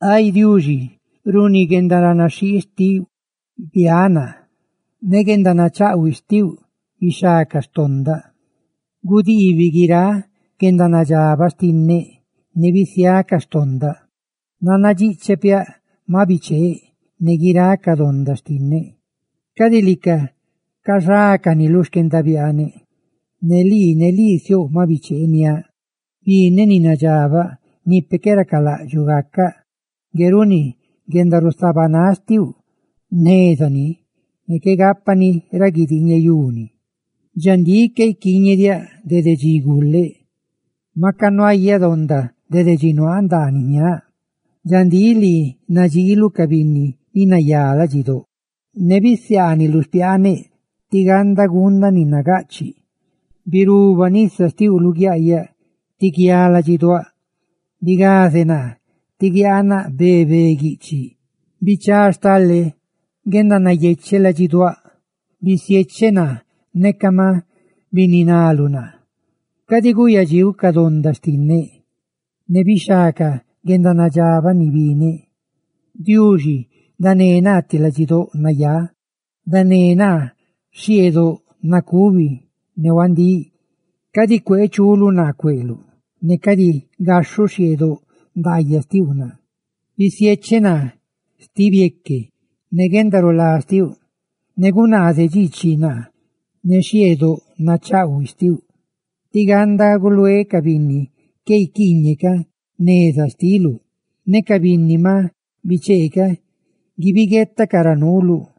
Ay Diuxi, runi guendaranaxhii xtiuꞌ biáꞌ naa; ne guendanachaꞌhuiꞌ xtiuꞌ bixhá ca xtondaꞌ. ¡Gudiibiꞌ guiráꞌ guendanadxabaꞌ xtinneꞌ! ¡Ne bisiá ca xtondaꞌ! Nannadxiꞌcheꞌ piaꞌ maꞌ bicheeꞌ; ne guiráꞌ ca donda xtinneꞌ cadi lica caxácani lu xquendabiaaneꞌ. Ne lii, ne lii siouꞌ maꞌ bicheeniáꞌ, bineꞌ ni nadxabaꞌ, ni peꞌ qué racalaꞌdxuꞌ gacaꞌ. Ngue runi guendarusabanáꞌ xtiuꞌ jneza ni; ne qué gápani ra guidiñeyuni. Dxandíꞌ, qué iquiiñediáꞌ dede dxi guleꞌ; maca nuayáꞌ donda dede dxi nuaaꞌ ndaaniꞌ jñaaꞌ. Dxandíꞌ, lii nadxiiluꞌ ca binni ni nayá ladxidóꞌ, ne bisiaaniluꞌ xpiaaneꞌ tí ganda guundaꞌ ni nagaꞌchiꞌ. Ne yaga hisopoa biruba nisa xtiuꞌ luguiaꞌyaꞌ, tí guiá ladxiduáꞌ; bigaze naa, tí guiaanaꞌ be be guiꞌchiꞌ. Bichá stale guendanayecheꞌ ladxiduáꞌ; bisiecheꞌ naa sti bieque, neca maꞌ bininaluꞌ naa. Cadi gúꞌyadxiuꞌ ca donda xtinneꞌ, ne bixhá ca guendanadxabaꞌ ni bineꞌ. Ay Diuxi, ¡dané naa ti ladxidóꞌ nayá!, ¡dané naa xhieꞌdoꞌb nacubi ne huandíꞌ! Cadi cuee chuluꞌ naa cueꞌluꞌ, ne cadi gaxhuꞌ xhieꞌdoꞌ ndaayaꞌ xtiuꞌ naa. Bisiecheꞌ naa sti bieque ne guendarulá xtiuꞌ; ne gunaazeꞌ dxiichiꞌ naa ne xhieꞌdoꞌ nachaꞌhuiꞌ xtiuꞌ, tí ganda guluéꞌ ca binni qué guiquiiñeꞌ ca neza xtiluꞌ ne ca binni maꞌ bichee ca guibiguetacaꞌ ra nuuluꞌ.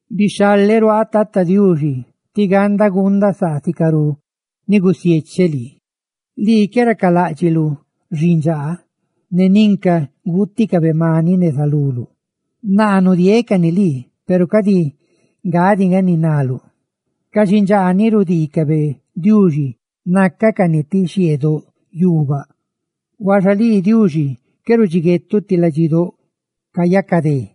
Bixhaleꞌ ruaaꞌ, Tata Diuxi, tí ganda guundaꞌ saa sicarú ni gusiecheꞌ lii. Lii qué racaláꞌdxiluꞌ xindxaa ne ninca guuticabe maniꞌ neza luluꞌ; naa nudieeꞌ cani lii, peru cadi nga diꞌ nga ni riuulaꞌdxuꞌ. Ca xindxaa ni rudiicabe Diuxi nácacani ti xhieꞌdoꞌ yuubaꞌ; ¡huaxa lii, Diuxi, qué rudxiguetuꞌ ti ladxidóꞌ cayacadé!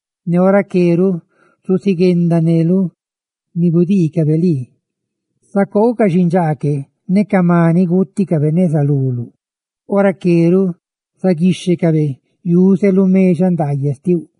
Ne ora que ruꞌ zuziguendaneluꞌ ni gudiicabe lii, zacoouꞌ ca xindxaa que ne ca maniꞌ guuticabe neza luluꞌ; ora que ruꞌ zaguíxhecabe yuze lu mexaꞌ ndaayaꞌ xtiuꞌ.